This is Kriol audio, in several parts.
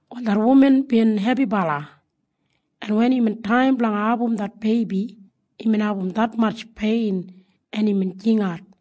Wal det wuman bin hebibala, en wen imbin taim blanga abum det beibi, imbin abum detmatj pein en imbin jingat.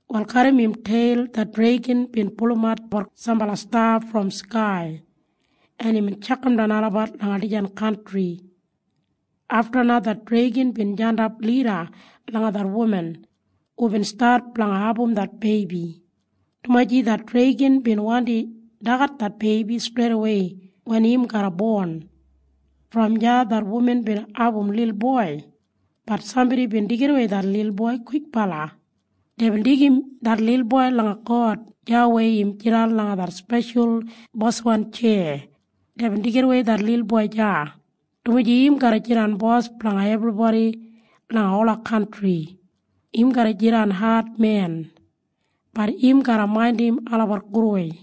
Wal garram im teil det dregan bin pulumatbat sambala sta brom skai, en imbin tjakamdan olabat langa dijan kantri. Afta na det dregan bin jandap lida langa det wuman hubin stat blanga abum det beibi, dumaji det dregan bin wandi dagat det beibi streidawei wen im garra bon. Brom deya det wuman bin abum lilboi. Bat sambodi bin deigidawei det lilboi kwikbala. Deibin deigim det lilboi langa God deya weya im jidan langa det speshal boswan tjeya. Deibin deigidawei det lilboi deya, dumaji im garra jidan Bos blanga ebribodi langa ola kantri. Im garra jidan admen. Bat im garra maindim olabat gudwei.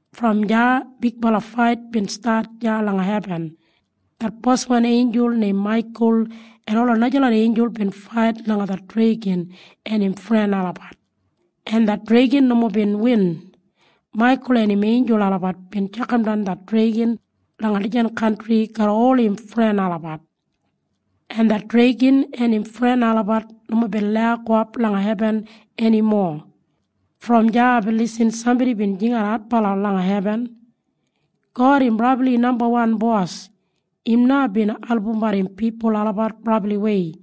Brom deya bigbala fait bin stat deya langa hebin. Det boswan einjul neim Maikul en ola najalot einjul bin fait langa det dregan en im fren olabat, en det dregan nomo bin win. Maikul en im einjul olabat bin tjakamdan det dregan langa dijan kantri garram ol im fren olabat, en det dregan en im fren olabat nomo bin lau gowap langa hebin enimo. Brom deya aibin lisin sambodi bin jingat adbala langa hebin, “God im brabli nambawan Bos. Im na bin albumbat im pipul olabat brabliwei.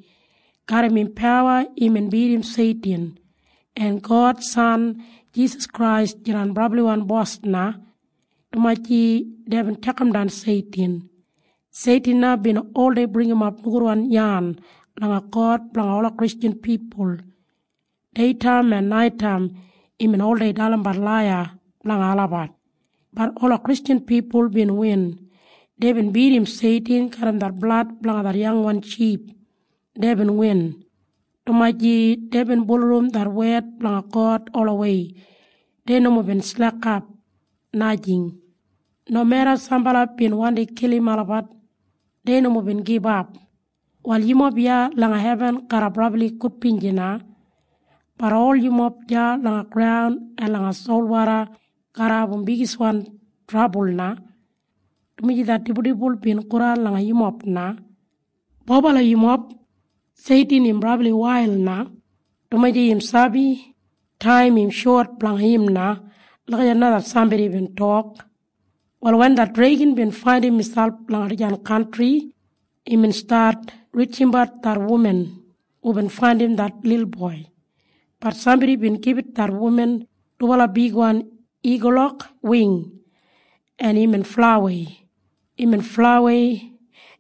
Garram im pawa imbin bidim Seitin. En God San Jisas Krais jidan brabliwan Bos na, dumaji deibin tjakamdan Seitin. Seitin na bin oldei bringimap nogudwan yan langa God blanga ola Kristjan pipul. Deitaim en naitaim imbin oldei dalimbat laiya blanga olabat. Bat ola Kristjan pipul bin win. Deibin bidim Seitin garram det blad blanga det yangwan ship. Deibin win, dumaji deibin bulurrum det wed blanga God olawei. Dei nomo bin slekap, najing. Nomeda sambala bin wandi kilim olabat dei nomo bin gibap. Wal yumob iya langa hebin garra brabli gudbinji na. Bat ol yumob deya langa graun en langa solwoda garra abum bigiswan trabul na, dumaji det dibuldibul bin godan langa yumob na. Bobala yumob! Seitin im brabli wail na, dumaji im sabi taim im shot blanga im na.” Lagijat na det sambodi bin tok. Wal wen det dregan bin faindim miselp langa dijan kantri, imbin stat rijimbat det wuman hubin faindim det lilboi. Bat sambodi bin gibit det wuman dubala bigwan igulok wing, en imbin flaiwei. Imbin flaiwei,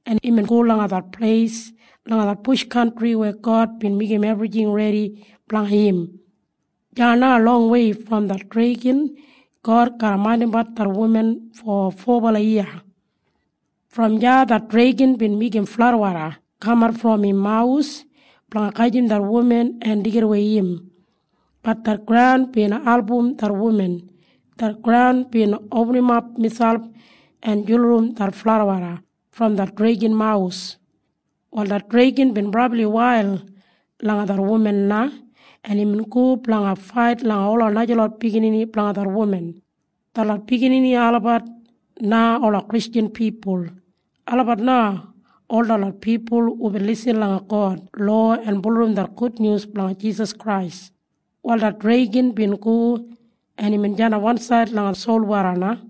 en imbin go langa det pleis langa det bush kantri weya God bin meigim ebrijing redi blanga im. Deya na longwei brom det dregan God garra maindimbat det wuman fo fobala yiya. Brom deya det dregan bin meigim fladwoda kamat brom im mawus blanga gajim det wuman en deigidawei im. Bat det graun bin album det wuman. Det graun bin opinimap miselp en julurum det fladwoda brom det dregan mawus. Wal det dregan bin brabli wail langa det wuman na, en imbin go blanga fait langa ola najalot biginini blanga det wuman. Detlot biginini olabat na ola Kristjan pipul. Olabat na ol detlot pipul hubin lisin langa God lowa en bulurrum det gudnyus blanga Jisas Krais. Wal det dregan bin go, en imbin jandap wansaid langa solwoda na.